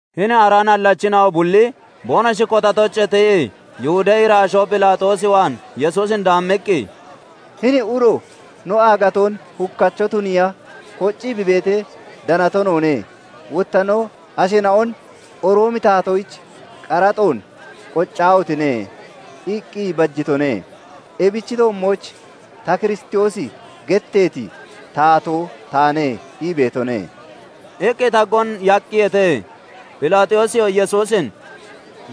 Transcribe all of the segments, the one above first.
Hini ara nallachina'o bulli boonoshi kotatoochee tiyii Yihudee iraashoo Phelaaxoos waan Yesuusin daammiqqi, "Hini uro no aagatoon hukacho tuniiya koccii bi beetee, danato noone. Wotta no asheena'on 'Roomi taatoyich qaraxoon qoccaahotine!' iqqi bajitone; ebichi toommooch 'Ta Kiristoosi getteeti taatoo taane' ii beetone" iqqi taggoon yaaqqiyeete. Phelaaxoosiyoo Yesuusin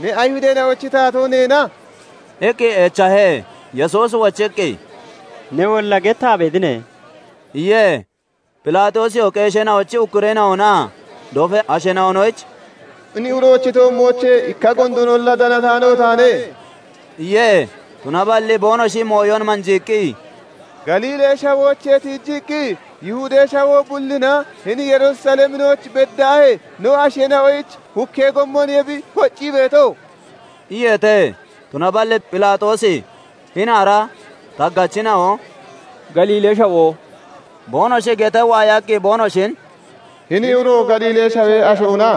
"Ne Ayihudeena'ochi taatoo neena?" iqqi echahe. Yesuusi wochiqqi, "Newolla gettaa beetine" iye. Phelaaxoosiyoo qeesheena'ochi ukkureena'onaa dofee asheena'onoyich "Hini uroochi toommoochee ikka gondoonolla danataano taane" iye. Tunaballi boonoshi mooyon manjiiqqi, "Galiilee shawooche tiijiqqi Yihudee shawoo bullinaa hini Yerusaleminooch beddaahee no asheena'oyich hukkee gommoniye bi koccii beeto" iyeete. Tunaballi Phelaaxoosi hini ara taggachina'o "Galiilee shawoo" boonoshi gettee waayaqqi, boonoshin "Hini uro Galiilee shawee ashoona?"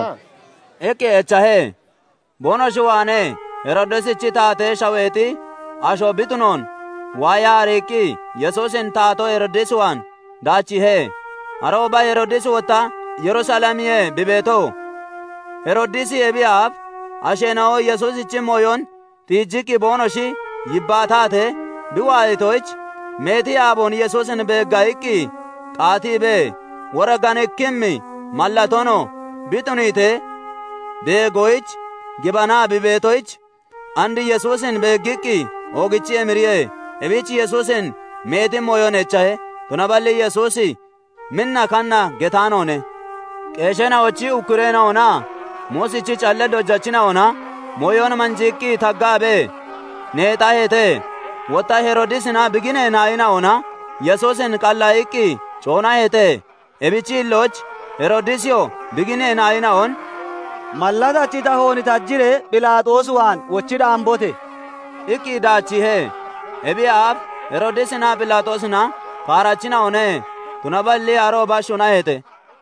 iqqi echahe. boonoshi waanee Heroodisichi taatee shaweexi asho bi tunoon waayaa ariiqqi Yesuusin taatoo Heroodis waan daachiihe. Arooba Heroodisi wotta Yerusalemiye bi beeto. Heroodisi ebiyee aaf asheena'o Yesuusichi mooyon tiijiqqi boonoshi yibbaatatee bi waayatoyich, meeti aaboon Yesuusin beegga iqqi qaatiibee, woriganikkimmi mallatoonoo bi tuniitee beegoyich gibanaa bi beetoyich, and Yesuusin beeggiqqi oogichii emiriye. Ebich Yesuusin meeti mooyon echahe; tunaballi Yesuusi minna kanna getaanoone. Qeesheena'ochi ukkureena'onaa Muusichi callee dojachina'ona mooyon manjiiqqi taggaabee neexaheete. Wotta Heroodisinaa bi ginee naayina'ona Yesuusin qallaayiqqi coonaheete; ebichi hillooch Heroodisiyoo bi ginee naayina'on "Mallatachi tahoon tajiree Phelaaxoos waan wochi daambote!" iqqi daachiihe. Ebiyee aaf Heroodisinaa Phelaaxoosina kaarachina'one; tunaballi arooba shunaheete.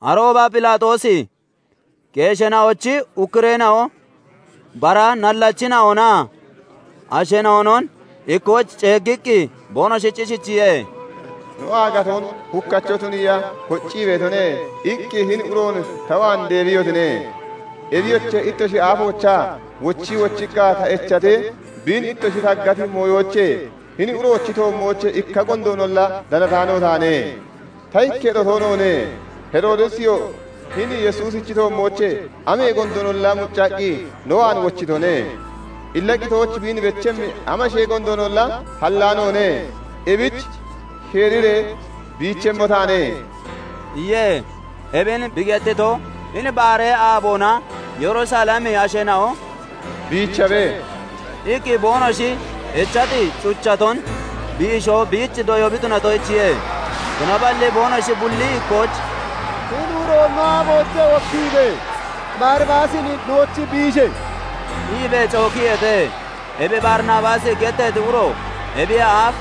Arooba Phelaaxoosi qeesheena'ochi ukkureena'o, bara nallachina'onaa asheena'onon ikkooch ceeggiqqi boonoshich ishichiye:- " 'No aagatoon hukkacho tuniiya koccii beetone' iqqi hini uroon ta waan deebiyotine. Ebiyoche, ittoshi aafoochaa wochii wochiqqa ta echatee, biin ittoshi taggati mooyoochee hini uroochi toommoochee ikka gondoonolla danataano taane. Ta ikketo toonoone; Heroodisiyoo hini Yesuusichi toommoochee amee gondoonolla muccaqqi no waan wochitone. Illa qitooch biin bechemmi amashee gondoonolla hallaanoone; Ebich sheeriree biichemmo taane" iye. [ Ebin bi gettito, hini baaree aaboona Yerusalemi asheena'o "Biichabe!" iqqi boonoshi echati cuchaton biisho biich doyoo bi tunatoyichiye.] Tunaballi boonoshi bulli ikkooch "Hini uroon no aafoochee wokkiibe! Baribaasin nooch biishe!" iibee cookiyeete. Ebi Baribaasi getteeti uro ebiyee aaf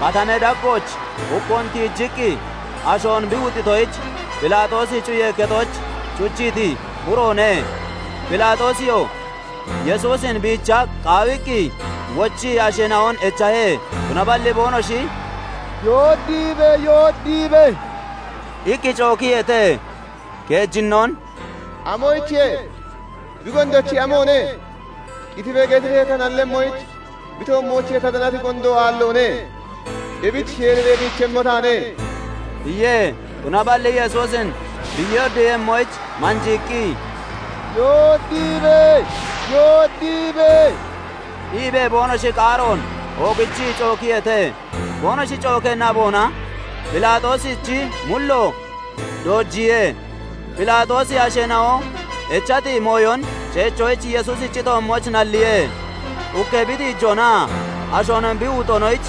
katamee daggooch hukkoon tiijiqqi ashoon bi wuxitoyich, Phelaaxoosi cuyee kexooch cuchiiti uroone. Phelaaxoosiyoo Yesuusin biicha qaawiqqi wochii asheena'on echahe; Tunaballi boonoshi "Yooddiibe! Yooddiibe!" iqqi cookiyeete. Keejinnoon "Amoyichiye? bi gondochi amoone? 'Qitibe!' getiree ta nallemmoyich bi toommoochee ta danati gondo aalloone; ebichi sheeriree biichemmo taane" iye. Tunaballi Yesuusin bi yooddiiyemmoyich manjiiqqi, "Yoodiibe! yoodiibe!" iibee boonoshi qaaroon oogichiqqi cookiyeete. Boonoshi cookee naboona Phelaaxoosichi mullo doojiye. Phelaaxoosi asheena'o echati mooyon ceechoyich Yesuusichi toommooch nalliye. Hukkee bi tiijoonaa ashoon bi wuxoonoyich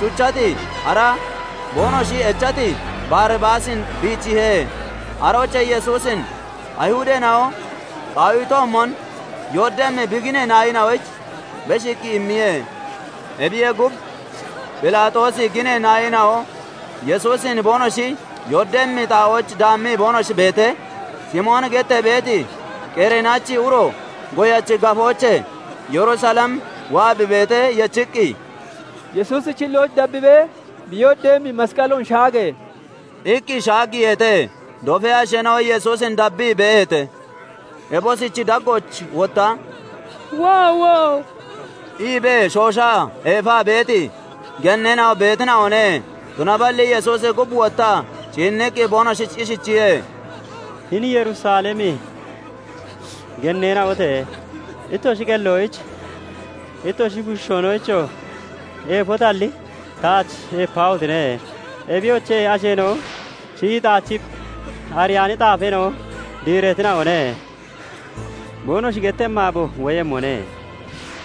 cuchati, ara boonoshi echati Baribaasin bichiihe; aroochee Yesuusin Ayihudeena'o qaawitoomon yooddemmi bi ginee naayina'oyich beshiiqqi immiye. Ebiyee gub, Phelaaxoosichi ginee naayina'o Yesuusin boonoshi yooddemmi xaa'ooch daammii boonoshi beetee, Simooni gettee beeti Qereenachi uro goyachi gafoochee Yerusalem waa bi beetee yechiqqi, "Yesuusichi hilloon dabbibee bi yooddeeyemmi masqaloon shaage!" iqqi shaaggiiheete. Dofee asheena'oo Yesuusin dabbii beeheete; ebosichi daggooch wotta "Woowo!" iibee shooshaa eefaa beeti genneena'oo beetina'one. Tunaballi Yesuusi gub wottaa ciinniqqi boonoshich ishichiye:- "Hini Yerusalemi genneena'ote! Ittoshi qelloyich, ittoshi bushiishoonoyichoo eefotalli, taach eepaahotine! Ebiyoche, asheena'o 'Shiyii xaachii ariyaani xaafeena'o diireetina'one' boonoshi gettemmi aabo woyemmone.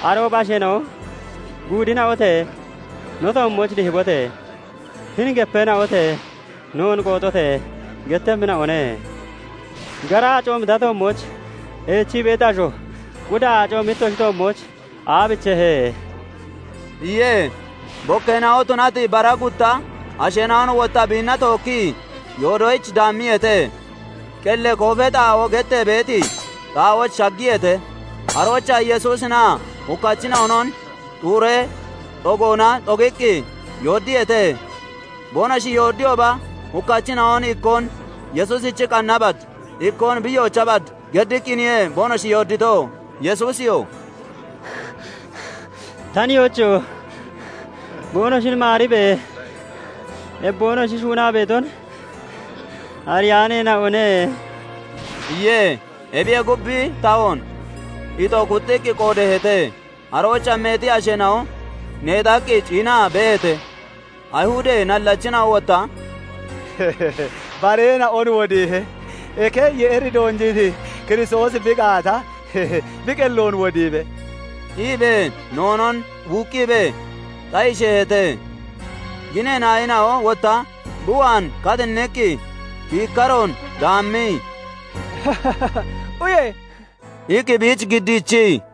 Arooba asheena'o 'Guuddina'ote! No toommooch dihibote! 'Hini gepeena'ote! Noon qooxote!' gettemmina'one. Gara aacoomi ta toommooch eechii beeti asho, quda aacoomi ittoshi toommooch aabichehe?" iye. Bikkeena'o tunati bara gutta asheena'on wotta biinna tookkii yoodoyich daammiyeete. "Qellee koofee xaa'oo" gettee beeti xaa'ooch shaggiyeete; aroochaa Yesuusinaa hukkachina'onon xuuree xogoona xogiqqi yooddiyeete; boonoshi yooddiyooba, hukkachina'on ikkoon Yesuusichi qanna bad, ikkoon bi yoocha bad geddiqqiniye boonoshi yoodito. [Yesuusiyoo "Ta nihoocho! Boonoshin maaribe! Ebi boonoshi shuunaa beeton ariyaaneena'one" iye.] Ebiyee gub, bi tahoon ixo kuxxiqqi qoodeeheete. Aroochaa meeti asheena'o neexaqqi ciinaa beeheete. Ayihudee nallachina'o wotta "Bareena'on wodiihe; eke Yeeri doonjiiti Kiristoosi bi gaata, bi qelloon wodiibe!" iibee noonoon wuuqqiibee xayisheeheete. Ginee naayina'o wotta bi waan katinniqqi kiikkaroon daammii, "Uye!" iqqi biich giddiichii,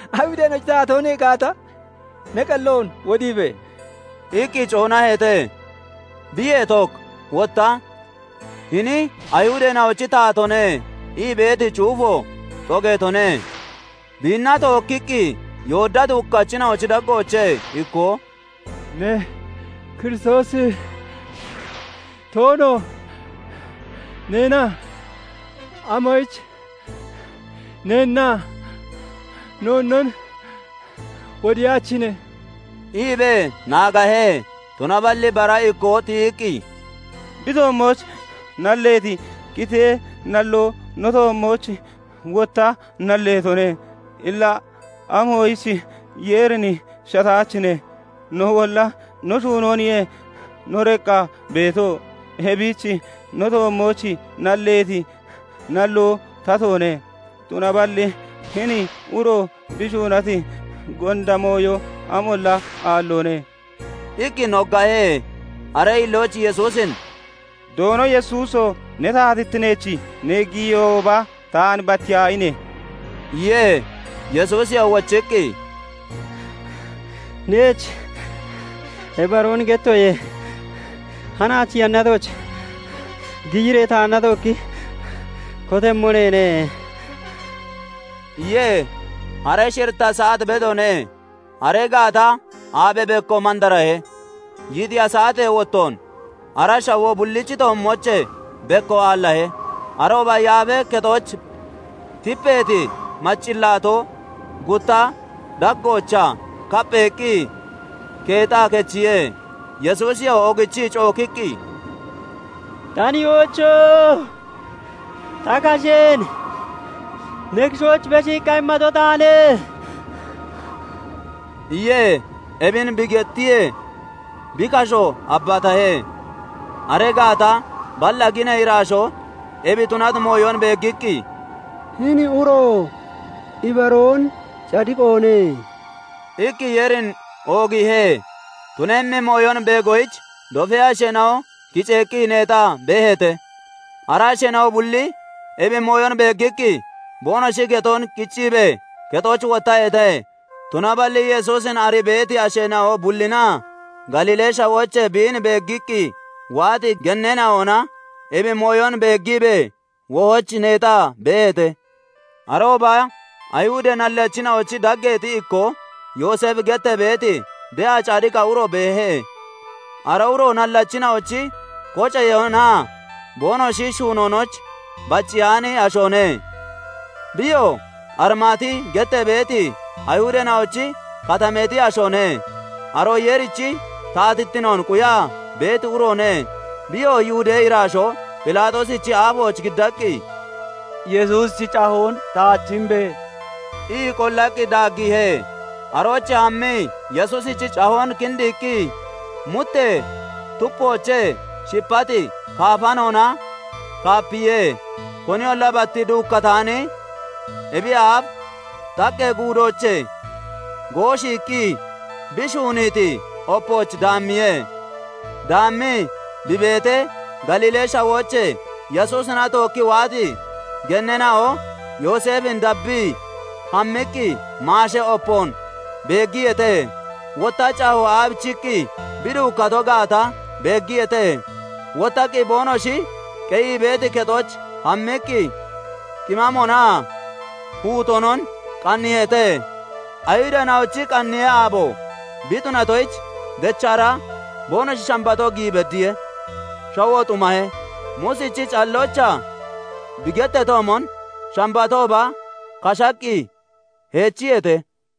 "Ayihudeena'ochi taatoo ne gaata, ne qelloon wodiibe!" iqqi coonaheete. Biyee took wotta "Hini Ayihudeena'ochi taatoone" ii beeti cuufo xogeetone. Biinna tookkiqqi yooddati hukkachina'ochi daggoochee ikkoo "Ne Kiristoosi toono neena? Amoyich neennaa noonnon wodiyaachine?" iibee naagahe. Tunaballi bara ikkoo tiyiqqi, "Bi toommooch nalleeti qitee nalloo ne toommooch wotta nalleetone. Illa amoyich Yeerin shattaachine? Noolla no shuunooniye no deqqaa beeto; ebich no toommooch nalleeti nalloo tatoone; tunaballi hini uro bi shuunati gonda mooyo amolla aalloone" iqqi noggahe. Aree hillooch Yesuusin "Doono Yesuuso! Ne taatittineech ne giyiyooba, taan battiyaahine!" iye. Yesuusiyoo wochiqqi, "Neech ibaroon gettoye; hanaach yannatooch giyiree taanna tookki kotemmo neene" iye. Hare shiritta saat bedoone; aree gaata aabee bekko mandarahe; yiixiya saatee wottoon ara shawoo bullichi toommoochee bekko aallahe. Arooba Yaafee Kexooch tipeeti maccillaatoo gutta daggoochaa kappheeqqi keexaa kechiye. Yesuusiyoo oogichii cookiqqi, "Ta nihoocho! Ta kasheen ne kishooch beshiiqqa immato taane" iye. Ebin bi gettiyee, bi kasho abbatahe. Aree gaata balla ginee iraashoo ebi tunati mooyon beeggiqqi, "Hini uro ibaroon cadiqoone" iqqi Yeerin oogiihe. Tunemmi mooyon beegoyich dofee asheena'o kiceeqqi neexaa beeheete; ara asheena'o bulli ebi mooyon beeggiqqi boonoshi getoon qicciibee kexooch wottaheete. Tunaballi Yesuusin arii beeti asheena'o bullinaa Galiilee shawoochee biin dabbiqqi waati genneena'ona ebi mooyon beeggiibee wohooch neexaa beeheete. Arooba Ayihudee nallachina'ochi dageexi ikkoo, Yooseefi gettee beeti de'a cadiqa uro beehe; Ara uro nallachina'ochi koceyoonaa boonoshi shuunoonooch bacceyaani ashoone; biyoo Arimaati gettee beeti Ayihudeena'ochi katameexi ashoone; aroo Yeerichi taatittinoon quyaa beeti uroone. Biyoo Yihudee iraashoo Phelaaxoosichi aafooch giddaqqi, "Yesuusichi cahoon taach imbe!" ii qollaqqi daaggiihe. Aroochee hammii Yesuusichi cahoon kindiiqqi muttee tupoochee shipati kaafanoona (macawoona) kaapiye; koniyolla bat duukkataani, ebiyee aaf xaqqee guudoochee gooshiiqqi bi shuuniiti opooch daammiye. Daammii bi beetee, Galiilee shawooche Yesuusina tookkii waati genneena'o Yooseefin dabbii hammiqqi maashee opoon beeggiyeete; wotta cahoo aabicheeqqi bi duukkato gaata beeggiyeete. Wottaqqi boonoshi qeyii beeti kexooch hammiqqi qimaamoonaa huutoonon qanniiheete. Ayihudeena'ochi qanniyee aabo bi tunatoyich, dechra boonoshi Shambatoo giyi beddiye; shawoo xumahe. Muusichi calloochaa bi getteetoomon Shambatooba kashaqqi heechiyeete.